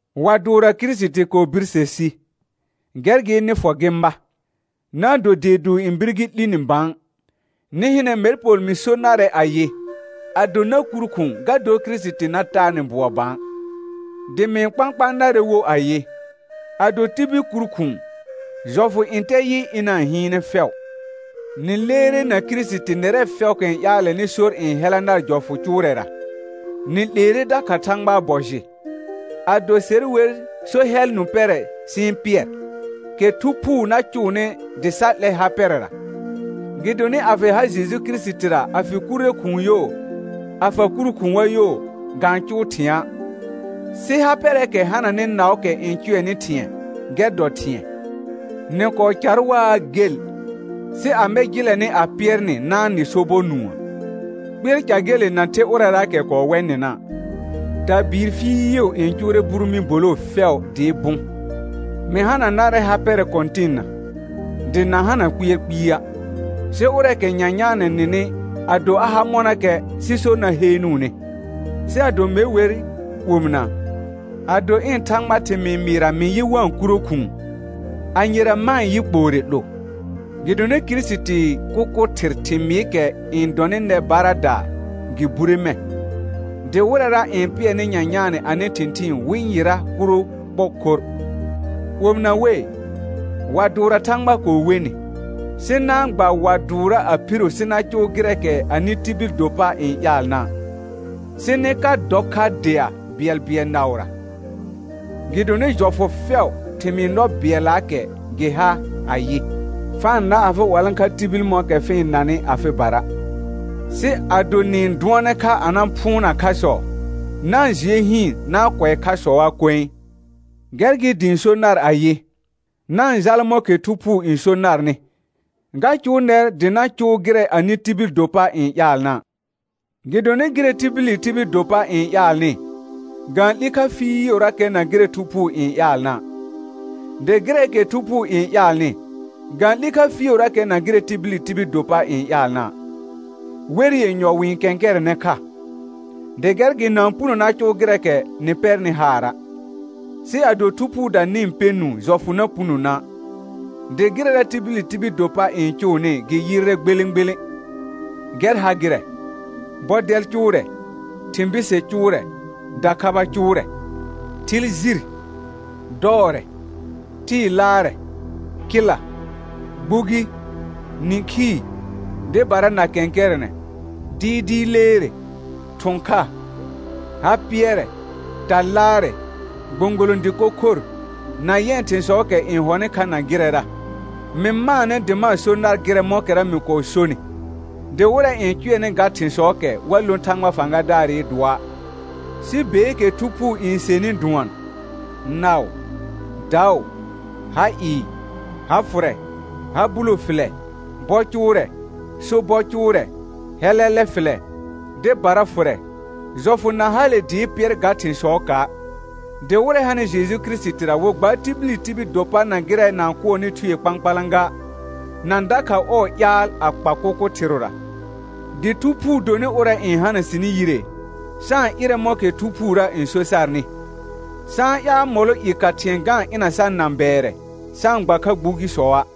Wa dʋʋrra Kirisiti kɔɔ birse si, gɛr gɩ nɩ fɔ gɩ ma, na-n do dee dʋʋr n bir gɩ 'li ni bã. Nɩ hɩnɛ mɛr Pol mɩ so narɛ ayɩ, ado na kur khʋ̃ʋ ga dor Kirisiti na taa nɩ bʋɔ bã. Dɩ mɩ-n kpãkpãa narɛ wo ayɩ, ado tibil kur khʋ̃ʋ, jɔfʋ ntɛ yɩ ɩna-n hɩɩnɛ fɛʋ. Nɩ leere na Kirisiti nɛrɛ fɛʋʋkɛ n ƴaalɛnɩ sor n hɛla nar jɔfʋ cʋʋrɛra, nɩ 'leere dakha Thãgbaa bɔ jɩ. Ado se wer so hɛl nũ pɛrɛ sɩ-n pɩɛr, kɛ Thu Phuu na cʋʋnɩ dɩ sa 'lɛ ha pɛrɛra. Gɩdonɩ a fɩ ha Jeju Kirisitira a fɩ kurre khʋ̃ʋ yo, a fa kur khʋ̃a yo, ga-n cʋʋ thɩ̃a', sɩ ha pɛrɛɛkɛ hananɩ naʋʋkɛ n cʋɛnɩ thɩ̃ɛ, gɛr dɔ thɩ̃ɛ. Nɩ kɔɔ car waa gel, sɩ amɛ jɩlɛ nɩ a pɩɛr nɩ na-n nɩ sobɔr nũə? Kpɩɛr ca gele na the ʋrɛraakɛ kɔɔ wɛ nɩna'. Tabɩɩr fɩɩʋ n cʋʋrɛ buru mɩ̃ boloo fɛʋ dɩɩ bʋ̃. Mɩ hana narɛ ha pɛrɛ Kɔ̃tɩnna, dɩ na hana kpɩɛr kpɩa', sɩ ʋrɛɛkɛ nyanyaanɛ nɩnɩ ado a ha mɔnakɛ, sɩ sor na heenuune. Sɩ ado me wer omɩna, ado ɩ̃ Thãgba thɩmɩɩ mɩɩra mɩ yɩ wa-n kuro khʋ̃ʋ, anyera ma-n yɩ kpoore 'lo? Gɩdonɩ Kirisitii kʋkʋ thɩr thɩmɩɩkɛ n dɔnɩ nɛ baradaa, gɩ bure mɛ̃. Dɩ wɩrɛra n pɩɛrnɩ nyanyaanɛ anɩ thɩ̃thɩɩn wɩ yɩra kuro kpɔ khorr. Omɩna wei, wa dʋʋrra Thãgba kɔɔ we nɩ, sɩ na-n gba wa dʋʋrra a phiro sɩ na cʋʋ gɩrɛɛkɛ anɩ tibil do pa n ƴaalna', sɩ nɩ ka dɔ kha dea bɩɛlbɩɛl naʋra. Gɩdonɩ jɔfʋ fɛʋ, thɩmɩɩ nɔ bɩɛllaakɛ gɩ ha ayɩ: «Fa-n na afɩ 'walãkha tibil mɔ̃kɛ fɩ-n nanɩ afɩbara.» Sɩ ado nɩ-n dʋɔnɛ kha a na phʋʋna khasɔ, na-n jɩɛ hɩɩn na-n kʋɛ khasɔa koe. Gɛr gɩ dɩ ɩ̃ so nar ayɩ: Na-n jala mɔ̃kɛ Thu Phuu n so narnɩ, ga cʋʋ nɛr dɩ na cʋʋ gɩrɛ anɩ tibil do pa n ƴaalna'. Gɩdonɩ gɩrɛ tibili tibil do pa n ƴaalnɩ, ga-n 'li kha fɩɩʋrakɛ na gɩrɛ Thu Phuu n ƴaalna'; dɩ gɩrɛɛkɛ Thu Phuu n ƴaalnɩ, ga-n 'li kha fɩɩʋrakɛ na gɩrɛ tibili tibil do pa n ƴaalna'; wɛr yenyɔ wɩ-n kɛ̃kɛrɛnɛ kha, dɩ gɛr gɩ na-n puno na cʋʋ gɩrɛɛkɛ nɩ pɛrnɩ haara'. Sɩ ado Thu Phuuda nɩ-n pɛ nũu jɔfʋ na puno na'. Dɩ gɩrɛra tibili tibil do pa n cʋʋnɩ gɩ yɩrrɛ gbelẽ gbelẽ, gɛr ha gɩrɛ: Bɔdɛl cʋʋrɛ, thɩ̃ bise cʋʋrɛ, dakhaba cʋʋrɛ, thɩl jir, dɔɔrɛ, tɩɩ laarɛ, kɩla, gbugi, nĩkhii, dɩbara na kɛ̃kɛrɛnɛ, dɩɩdɩɩ leere, thʋ̃ kha, ha pɩɛrɛ, ta laarɛ, gbõgolõ dɩko khor, na yɛ̃ thĩsɔɔkɛ n hɔnɩ kha na gɩrɛra. Mɩ maanɛ dɩ ma-n so nar gɩrɛ mɔ̃kɛra mɩ kɔɔ sonɩ, dɩ wɩrɛ n cʋɛnɩ ga thɩ̃sɔɔkɛ wa lõ Thãgba fãgadaarɩ dʋɔa'. Sɩ beekɛ Thu Phuu n senɩ dʋɔn: Naʋ, daʋ, ha ɩɩ, ha fʋrɛ, ha bulo fɩlɛ, bɔ cʋʋrɛ, sobɔ cʋʋrɛ, hɛlɛlɛ fɩlɛ, dɩbara fʋrɛ; jɔfʋ na hale dɩɩ pɩɛr ga thɩ̃sɔɔka'. Dɩ wɩrɛ hanɩ Jeju Kirisitira wɩ gbaar tibili tibil do pa na gɩrɛ na-n kʋɔnɩ thue kpãkpalã ga, na dakha ɔɔ ƴaal a kpa kʋkʋ thɩrʋra. Dɩ Thu Phuu donɩ ʋrɛ n hana sɩnɩ yire, sa-n ɩrɛ mɔ̃kɛ Thu Phuurə n so sarnɩ. Sa-n ƴaal mɔlɔ i ka thɩ̃ɛ ga-n ɩna sar nãbɛɛrɛ, sa-n gba kha gbugisɔa'.